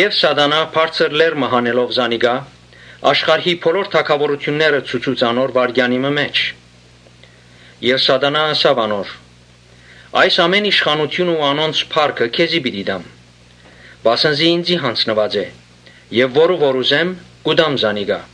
Սատանան բարձր լեռ մը հանելով զանիկա, աշխարհի բոլոր թագաւորութիւնները ցուցուց անոր վայրկեանի մը մէջ Եւ ըսաւ անոր. «Այս ամէն իշխանութիւնը ու անոնց փառքը քեզի պիտի տամ. վասն զի ինծի յանձնուած է եւ որու որ ուզեմ՝ կու տամ զանիկա,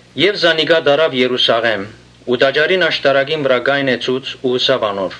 Սատանան Յիսուսը տարաւ Երուսաղէմ ու տաճարին աշտարակին վրայ կայնեցուց ու ըսաւ անոր.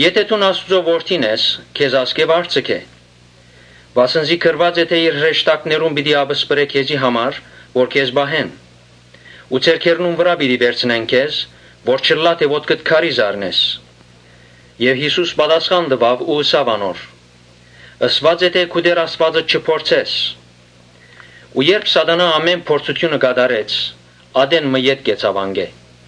«Եթէ դուն Աստուծոյ Որդին ես, քեզ ասկէ վար ձգէ. Վասն զի գրուած է թէ՝ ‘Իր հրեշտակներուն պիտի ապսպրէ քեզի համար, որ քեզ պահեն. Ու ձեռքերնուն վրայ պիտի վերցնեն քեզ, որ չըլլայ թէ ոտքդ քարի զարնես’»։ Յիսուս պատասխան տուաւ ու ըսաւ անոր. «Ըսուած է թէ Քու Տէր Աստուածդ չփորձես»։ Ու երբ Սատանան ամէն փորձութիւնը կատարեց՝ ատեն մը ետ կեցաւ անկէ։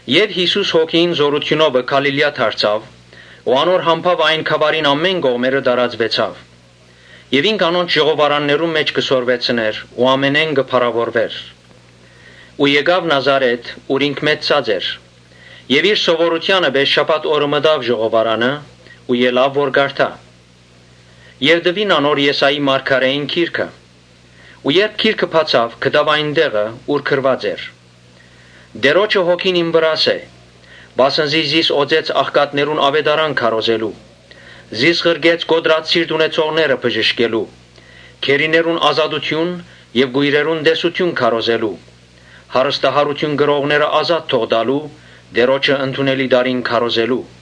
Յիսուս Հոգիին զօրութիւնովը Գալիլիա դարձաւ ու անոր համբաւը այն գաւառին բոլոր կողմերը տարածուեցաւ։ Ինք անոնց ժողովարաններուն մէջ կը սորվեցնէր ու ամենէն կը փառաւորուէր։ Երբ եկաւ Նազարէթ, ուր ինք մեծցած էր, իր սովորութեանը պէս շաբաթ օրը մտաւ ժողովարանը ու ելաւ որ կարդայ։ Տուին անոր Եսայի մարգարէին գիրքը։ Երբ գիրքը բացաւ, գտաւ այն տեղը՝ ուր գրուած էր. «Տէրոջը Հոգին իմ վրաս է. Կամ, անոր համարվասն զի զիս օծեց աղքատներուն աւետարան քարոզելու, զիս ղրկեց կոտրած սիրտ ունեցողները բժշկելու, Գերիներուն ազատութիւն եւ կոյրերուն տեսութիւն քարոզելու, հարստահարութիւն կրողները ազատելու, Տէրոջը ընդունելի տարին քարոզելու»։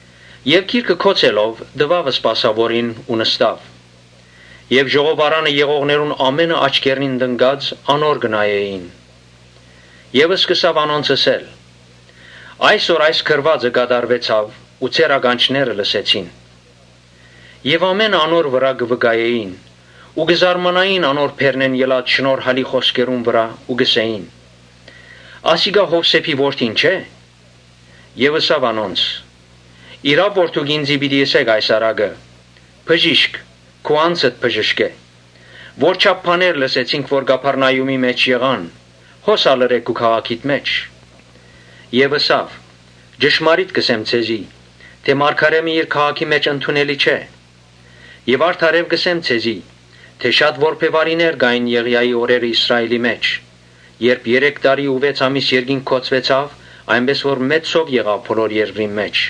Եւ գիրքը գոցելով՝ տուաւ սպասաւորին ու նստաւ։ Ժողովարանը եղողներուն ամէնքը աչքերնին տնկած անոր կը նայէին։ Սկսաւ անոնց ըսել. «Այսօր այս գրուածը կատարուեցաւ ու ձեր ականջները լսեցին»։ Ամէնքը անոր համար կը վկայէին ու կը զարմանային անոր բերնէն ելած շնորհալի խօսքերուն վրայ ու կ’ըսէին. «Ասիկա Յովսէփին որդին չէ՞»։ Ըսաւ անոնց. «Իրաւ դուք ինծի պիտի ըսէք այս առակը. ‘Բժիշկ, քու անձդ բժշկէ։ Որչափ բաներ լսեցինք որ Կափառնայումի մէջ եղան, հոս ալ ըրէ քու քաղաքիդ մէջ’»։ Յիսուս ըսաւ. «Ճշմարիտ կ’ըսեմ ձեզի, թէ՝ Մարգարէ մը իր քաղաքին մէջ ընդունելի չէ։ Արդարեւ կ’ըսեմ ձեզի, թէ՝ շատ որբեւարիներ կային Եղիային օրերը Իսրայէլի մէջ, երբ երեք տարի ու վեց ամիս երկինք գոցուեցաւ, այնպէս որ մեծ սով եղաւ բոլոր երկրին մէջ.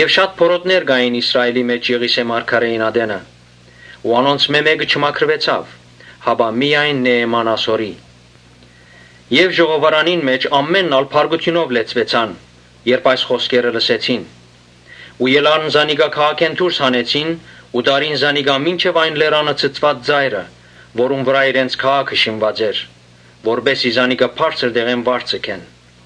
Շատ բորոտներ կային Իսրայէլի մէջ Եղիսէ մարգարէին ատենը ու անոնցմէ մէ՛կը չմաքրուեցաւ, հապա միայն Նէեման Ասորին»։ Ժողովարանին մէջ ամէնքն ալ բարկութիւնով լեցուեցան՝ երբ այս խօսքերը լսեցին Ու ելան զանիկա քաղաքէն դուրս հանեցին ու տարին զանիկա մինչեւ այն լերան ցցուած ծայրը, որուն վրայ իրենց քաղաքը շինուած էր, որպէս զի զանիկա բարձր տեղէն վար ձգեն։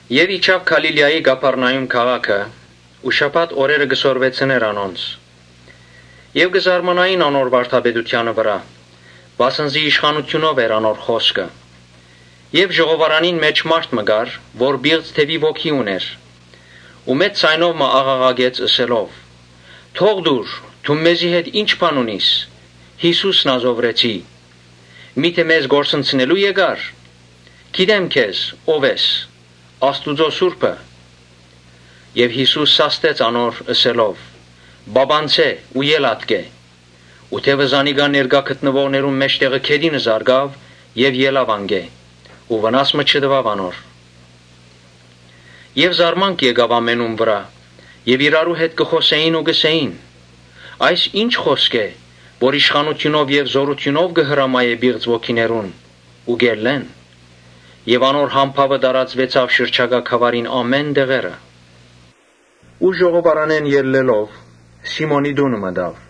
Իջաւ Գալիլիայի Կափառնայում քաղաքը ու շաբաթ օրերը կը սորվեցնէր անոնց։ Բոլորը կը զարմանային անոր վարդապետութեանը վրայ, վասն զի իշխանութիւնով էր անոր խօսքը։ Ժողովարանին մէջ մարդ մը կար, որ պիղծ դեւի ոգի ունէր, որը մեծ ձայնով մը աղաղակեց, ըսելով. «Թո՛ղ տուր, դուն մեզի հետ ի՞նչ բան ունիս, Յիսուս Նազովրեցի. միթէ մեզ կորսնցնելո՞ւ եկար. գիտեմ ո՛վ ես, Աստուծոյ Սուրբը»։ Յիսուս սաստեց զայն՝ ըսելով. «Պապանձէ ու ե՛լ ատկէ»։ Ու դեւը զանիկա ներկայ գտնուողներուն մէջտեղը գետինը զարկաւ եւ ելաւ անկէ ու վնաս մը չտուաւ անոր։ Ամէնքը զարմացած իրարու հետ կը խօսէին ու կ’ըսէին. «Այս ի՞նչ խօսք է, որ իշխանութիւնով ու զօրութիւնով կը հրամայէ պիղծ ոգիներուն ու կ’ելլեն»։ Եւ անոր համբաւը տարածուեցաւ շրջակայ գաւառին բոլոր կողմերը։ Ժողովարանէն ելլելով՝ Սիմոնին տունը մտաւ։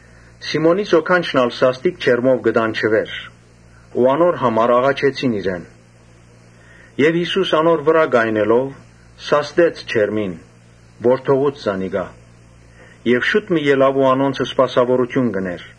Սիմոնին զոքանչը սաստիկ ջերմով կը տանջուէր։ Անոր համար աղաչեցին իրեն։ Եւ Յիսուս անոր քով կայնելով՝ սաստեց ջերմը, որը թողուց զանիկա։ Կինը շուտ մը ելաւ ու անոնց սպասաւորութիւն կ’ընէր։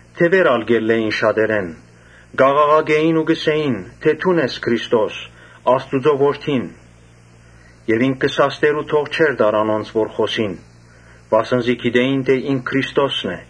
Դեւեր ալ կ’ելլէին շատերէն, կ’աղաղակէին ու կ’ըսէին. «Դուն ես Քրիստոսը, Աստուծոյ Որդին»։ Բայց ինք կը սաստէր ու թող չէր տար անոնց որ խօսին, վասն զի գիտէին թէ ինք Քրիստոսն է։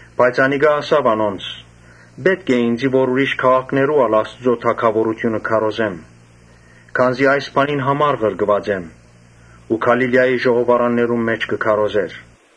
Բայց անիկա ըսաւ անոնց. «Պէտք է ինծի որ ուրիշ քաղաքներու ալ Աստուծոյ թագաւորութիւնը քարոզեմ, քանզի այս բանին համար ղրկուած եմ»։ Ու Գալիլիայի ժողովարաններուն մէջ կը քարոզէր։